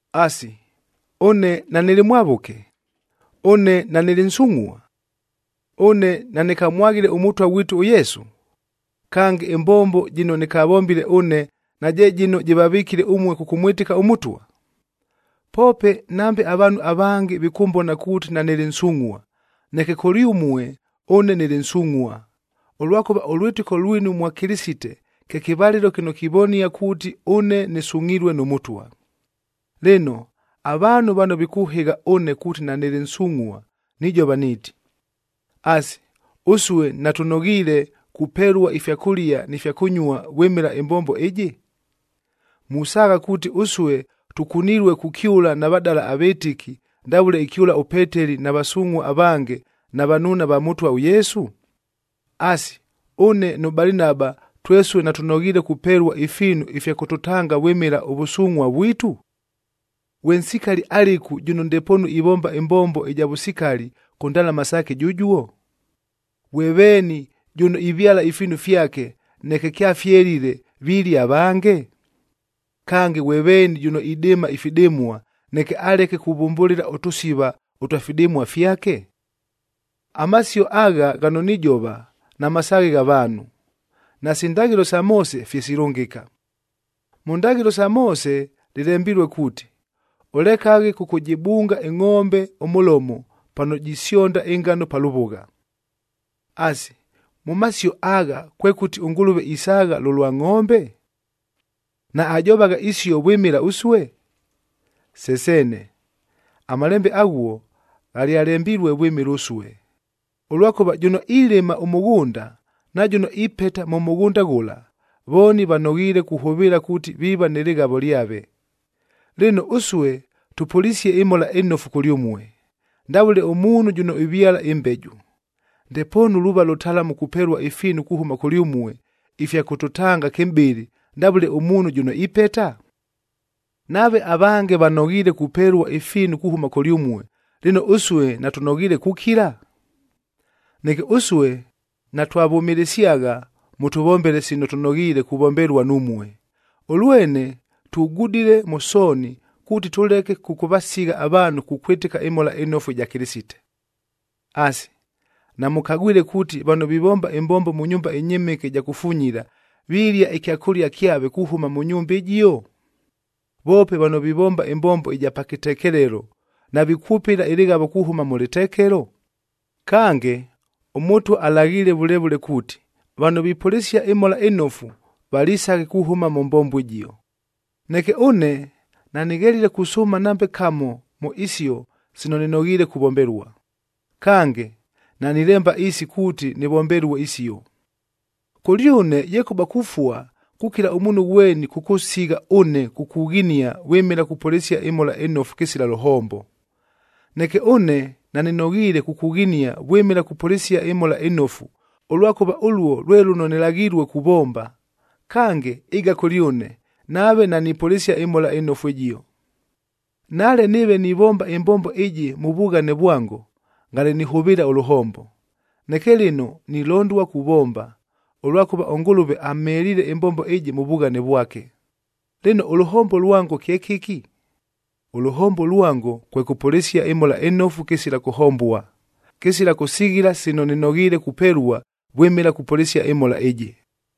Asi, ʉne nanɨlɨ mwavʉke? Ʉne nanɨlɨ nsungʼhua? Ʉne nanɨkamwaghile ʉMʉtwa ghwitu ʉYesu? Kange, ɨmbombo jɨno nɨkavombile ʉne naje jɨno jɨvavɨkile ʉmue kʉkʉmwɨtɨka ʉMʉtwa? Poope nambe avaanhu avange vikʉmbona kuuti nanɨlɨ nsungʼhua, neke kʉlyʉmue ʉne nɨlɨ nsungʼhua, ʉlwakʉva ʉlwɨtɨko lwinu mwa Kɨlɨsite kye kɨvalɨlo kɨno kivonia kuuti ʉne nɨsungʼhilue nʉ Mʉtwa. Lɨno, avaanhu vano vikʉhɨgha ʉne kuuti nanɨlɨ nsungʼhua, nijova niiti: Asi, ʉsue natʉnoghiile kupelua ifya kʉlia ni fya kʉnyuaa vwɨmɨla ɨmbombo ɨjɨ? Musaagha kuuti ʉsue tʉkunilue kukyʉla na vadala avɨtɨki, ndavʉle ikyʉla ʉPeteli na vasungʼhua avange na vanuuna va Mʉtwa ʉYesu? Asi, ʉne nʉ Balinaba twesue natʉnoghiile kupelua ifiinu ifya kʉtʉtanga vwɨmɨla ʉvʉsungʼhua vwitu? Ghwe nsikali alɨku jʉno ndepoonu ivomba ɨmbombo ɨja vʉsikali kʉ ndalama saake jʉjuo? Ghwe veeni jʉno ivyala ifiinu fyake, neke kyafyelile vilia avange? Kange, ghwe veeni jʉno idɨɨma ifidɨmua, neke aleke kuvʉmbʉlɨla ʉtʉsiva ʉtwa fidɨmua fyake? Amasio agha ghano nijova, namasaaghe gha vaanhu, nasi ndaghɨlo isa Moose fye silʉngɨka. Mʉ ndaghɨlo isa Moose lɨlembilue kuuti, “Ʉlekaghe kʉkʉjɨbunga ɨngʼombe ʉmʉlomo pano jisyonda ɨngano pa lʉvʉgha.”b Asi, mʉ masio agha, kwekʉti ʉNgʉlʉve isaagha lʉlwa ngʼombe? Naajovagha isio vwɨmɨla ʉsue? Se seene! Amalembe aghuo ghalyalembilue vwɨmɨla ʉsue! Ʉlwakʉva jʉno ilɨma ʉmʉghʉnda, na jʉno ipeta mʉ mʉghʉnda ghʉla, vooni vanoghiile kuhʉvɨɨla kuuti viiva nɨ lɨghavo lyave. Lɨno, ʉsue tʉpʉlisie ɨMhola ɨNofu kʉlyʉmue, ndavʉle ʉmuunhu jʉno ivyala ɨmbeju, ndepoonu luuva lʉtalamu kupelua ifiinu kuhʉma kʉlyʉmue ifya kʉtʉtanga kɨmʼbɨlɨ, ndavʉle ʉmuunhu jʉno ipeta? Nave avange vanoghiile kupelua ifiinu kuhʉma kʉlyʉmue, lɨno ʉsue natʉnoghiile kukila? Neke ʉsue natwavʉmɨlɨsyagha mʉtʉvombele sino tʉnoghiile kuvombelua numue, ʉlwene tugudile mʉ sooni kuuti tʉleke kʉkʉvasigha avaanhu kukwɨtɨka ɨMhola ɨNofu ɨja Kɨlɨsite. Asi, namʉkagwile kuuti vano vivomba ɨmbombo mʉ nyumba ɨnyɨmɨke ɨja kufunyila, vilia ɨkyakʉlia kyave kuhʉma mʉ nyumba ɨjio? Voope vano vivomba ɨmbombo ɨja pa kɨtekelelo, navikwʉpɨla ɨlɨghavo kuhʉma mʉ lɨtekelo? Kange, ʉMʉtwa alaghiile vʉle vʉle kuuti, vano vipʉlɨsia ɨMhola ɨNofu, valisaghe kuhʉma mʉ mbombo ɨjio. Neke ʉne, nanɨghelile kusʉʉma nambe kamo mʉ isio sino nɨnoghiile kuvombelua. Kange, nanilemba isi kuuti nɨvombelue isio. Kʉlyʉne yekʉba kufua kukila ʉmuunhu ghweni kʉkʉsigha ʉne kukughinia vwɨmɨla kupʉlɨsia ɨMhola ɨNofu kɨsila lʉhombo. Neke ʉne nanɨnoghiile kukughinia vwɨmɨla kupʉlɨsia ɨMhola ɨNofu, ʉlwakʉva ʉluo lwe lʉno nilaghilue kuvomba. Kange ɨga kʉlyʉne, nave nanipʉlɨsia ɨMhola ɨNofu ɨjio. Nale nɨɨve nivomba ɨmbombo ɨjɨ mʉ vughane vwango, ngale nihʉvɨɨla ʉlʉhombo, neke lɨno nilondua kuvomba, ʉlwakʉva ʉNgʉlʉve amheliile ɨmbombo ɨjɨ mʉ vughane vwake. Lɨno, ʉlʉhombo lwango kye kɨki? Ʉlʉhombo lwango kwe kʉpʉlɨsia ɨMhola ɨNofu kɨsila kʉhombua, kɨsila kʉsighila sino nɨnoghiile kupelua vwɨmɨla kupʉlɨsia ɨMhola ɨjɨ.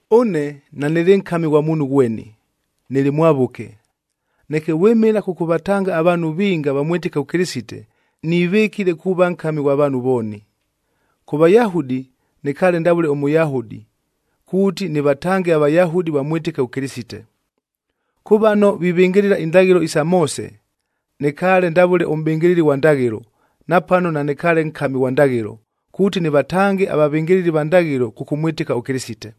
Ʉne nanɨlɨ nkami ghwa muunhu ghweni, nɨlɨ mwavʉke. Neke vwɨmɨla kʉkʉvatanga avaanhu vinga vamwɨtɨke ʉKɨlɨsite, nivɨkile kuuva nkami ghwa vaanhu vooni. Kʉ Vayahudi, nɨkaale ndavʉle ʉMʉyahudi, kuuti nɨvatange aVayahudi vamwɨtɨke ʉKɨlɨsite. Kʉ vano vivɨngɨlɨla indaghɨlo isa Moose, nɨkaale ndavʉle ʉmʼbɨngɨlɨli ghwa ndaghɨlo napano nanɨkaale nkami ghwa ndaghɨlo, kuuti nɨvatange avavɨngɨlɨli va ndaghɨlo kʉkʉmwɨtɨka ʉKɨlɨsite.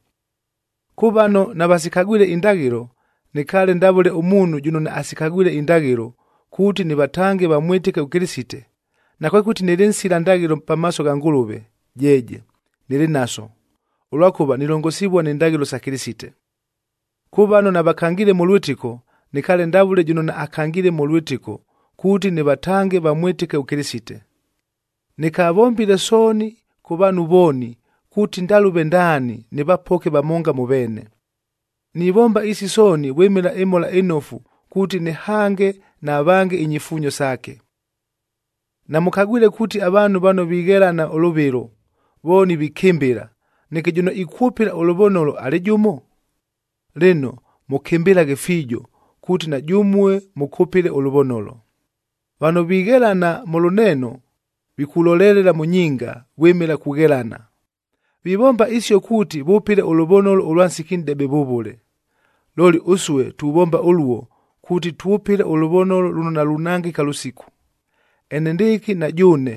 Kʉ vano navasikagwile indaghɨlo, nɨkaale ndavʉle ʉmuunhu jʉno naasikagwile indaghɨlo kuuti nɨvatange vamwɨtɨke ʉKɨlɨsite, nakwekʉti nɨlɨ nsila ndaghɨlo pamaaso gha Ngʉlʉve, jeeje, nɨlɨ naso, ʉlwakʉva nilongosivua ni ndaghɨlo isa Kɨlɨsite. Kʉ vano navakangiile mʉ lwɨtɨko, nɨkaale ndavʉle jʉno naakangiile mʉ lwɨtɨko kuuti nɨvatange vamwɨtɨke ʉKɨlɨsite. Nɨkavombile sooni kʉ vaanhu vooni, kuuti ndalʉve ndaani nɨvapoke vamonga mʉ veene. Nivomba isi sooni vwɨmɨla ɨMhola ɨNofu kuuti nɨhange na vange inyifuunyo saake. Namʉkagwile kuuti avaanhu vano vighelana ʉlʉvɨlo, vooni vikɨmbɨla, neke jʉno ikwʉpɨla ʉlʉvonolo alɨ jʉmo? Lɨno, mʉkɨmbɨlaghe fiijo kuuti na jʉmue mʉkʉpɨle ʉlʉvonolo. Vano vighelana mʉ lʉneeno, vikulolelela mʉ nyinga vwɨmɨla kughelana. Vivomba isio kuuti vʉpɨle ʉlʉvonolo ʉlwa nsiki nʼdebe vʉvʉle. Looli ʉsue tuvomba ʉluo kuuti twʉpɨle ʉlʉvonolo lʉno nalunangɨka lʉsiku. Enendɨɨkɨ na jʉʉne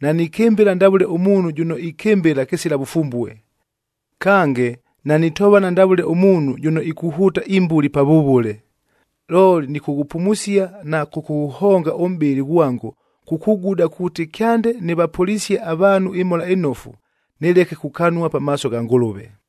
nanikɨmbɨla ndavʉle ʉmuunhu jʉno ikɨmbɨla kɨsila vʉfumbue, kange nanitovana ndavʉle ʉmuunhu jʉno ikuhʉʉta imbuli pavʉvʉle. Looli nɨkʉghʉpumusia na kʉkʉghʉhonga ʉmʼbɨlɨ ghwango kukuguda kuuti kyande nɨvapʉlisie avaanhu ɨMhola ɨNofu, nɨleke kukanua pamaaso gha Ngʉlʉve.